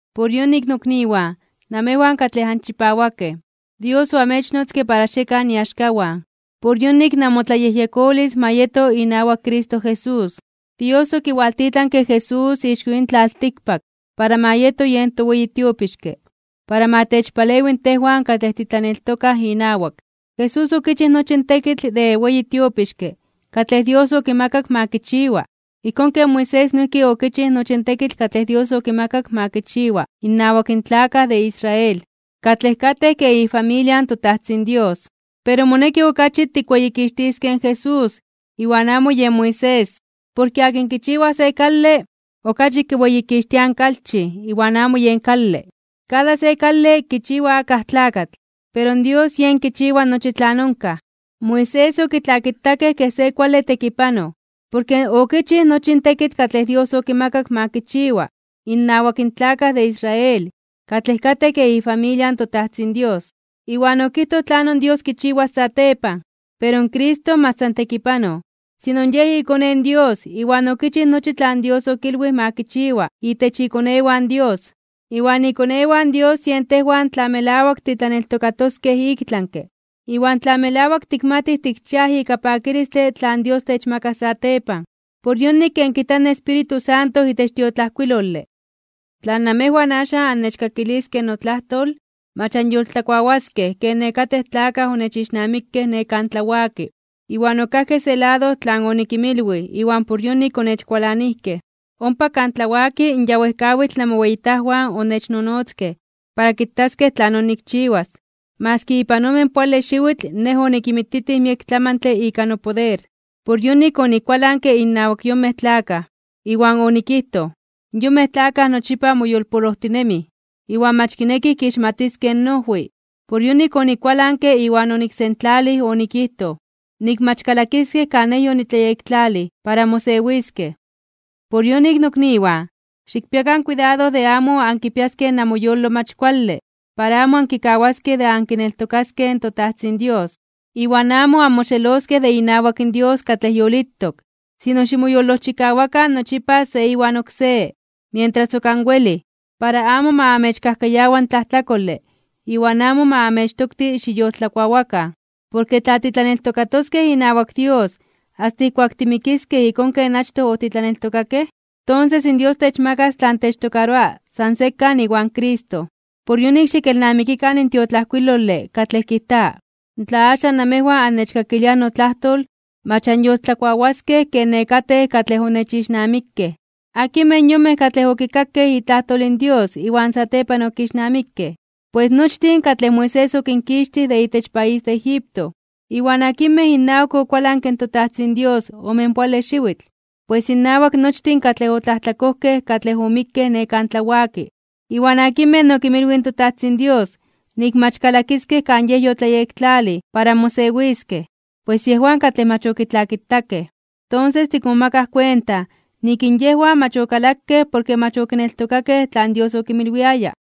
Por yonik, nokniwan, namejwan katlej anchipawakej, Dios oamechnotzke para xiekan iaxkawan, por yonik namotlayejyekolis ma yeto inawak Cristo Jesús. Dios okiwaltitlanke in Jesús ixko yin tlaltikpak para ma yeto yen toweyi tiopixke para ma techpalewi tejwan katlej titlaneltokaj inawak. Jesús okichij nochi in tekitl de weyi tiopixke katlej Dios okimakak ma kichiwa, ijkón ken Moisés noijki okichij nochi in tekitl katlej Dios okimakak ma kichiwa innawak in tlakaj de Israel, katlej katej kej ifamilia in toTajtzin Dios. Pero moneki okachi tikweyikixtiskej in Jesús iwan amo yen Moisés. Porke akin kichiwa se kale, okachi kiweyikixtiaj in kalchij iwan amo yen kale. Kada se kale kichiwa akaj tlakatl, pero Dios yen kichiwa nochi tlan onkaj. Moisés okitlakitakej kej se kuale tekipanoj porke okichij nochi in tekitl katlej Dios okimakak ma kichiwa innawak in tlakaj de Israel katlej katej kej ifamilia in toTajtzin Dios, iwan okijtoj tlanon Dios kichiwas satepan. Pero Cristo mach san tekipanoj, sino Yej iKone in Dios iwan okichij nochi tlan Dios okilwij ma kichiwa itech ikonewan Dios. Iwan ikonewan Dios yen tejwan tla melawak titlaneltokatoskej iktlanke (ik tlami), iwan tla melawak tikmatij tikchiaj ika pakilistle tlan Dios techmakas satepan. Por yonik, ken kijta in Espíritu Santo itech tiotlajkuilole: Tla namejwan axan annechkakiliskej notlajtol, mach anyoltlakuawaskej ken nekatej katlej onechixnamikej ne kan tlawaki, iwan okajkej se lado tlan onikinmilwij iwan por yonik onechkualanijkej. Ompa kan tlawaki in ya wejkawitl namoweyitajwan onechnonotzkej para kitaskej tlanon nikchiwas, maski ipan omenpoale xiwitl Nej onikinmititij miek tlamantle ika nopoder. Por yonik onikualanke innawak in yonmej tlakaj, iwan onikijtoj: “Yonmej tlakaj nochipa moyolpolojtinemij, iwan mach kinekij kixmatiskej noojwi.” Por yonik onikualanke iwan oniksentlalij onikijtoj, nik mach kalakiskej kan Nej yonitlayektlalij para mosewiskej. Por yonik, nokniwan, xikpiakan kuidado de amo ankipiaskej namoyolo mach kuale para amo ankikawaskej de ankineltokaskej in toTajtzin Dios, iwan amo anmoxeloskej de inawak Dios katlej yolitok. Sino, ximoyolojchikawakan nochipa se iwan oksé, mientras ok anwelij, para amo ma amechkajkayawa in tlajtlakole iwan amo ma amechtokti xiyoltlakuawakan. Porke tla titlaneltokatoskej inawak Dios asta ijkuak timikiskej ijkón ken achtoj otitlaneltokakej, tonses in Dios techmakas tlan techtokaroa san sekan iwan Cristo. Por yonik xikelnamikikan in tiotlajkuilole katlej kijta: Tla axan namejwan annechkakiliaj notlajtol, mach anyoltlakuawaskej ken nekatej katlej onechixnamikej. ¿Akinmej yonmej katlej okikakej itlajtol in Dios iwan satepan okixnamikej? Pues nochtin katlej Moisés okinkixtij de itech país de Egipto. ¿Iwan akinmej innawak okualanke in toTajtzin Dios omenpoale xiwitl? Pues innawak nochtin katlej otlajtlakojkej katlej omikkej ne kan tlawaki. ¿Iwan akinmej okinmilwij in toTajtzin Dios nik mach kalakiskej kan Yej yotlayektlalij para mosewiskej? Pues yejwan katlej mach okitlakitakej. Tonses tikmomakaj kuenta nik in yejwan mach okalakej porke mach okineltokakej tlan Dios okinmilwiaya.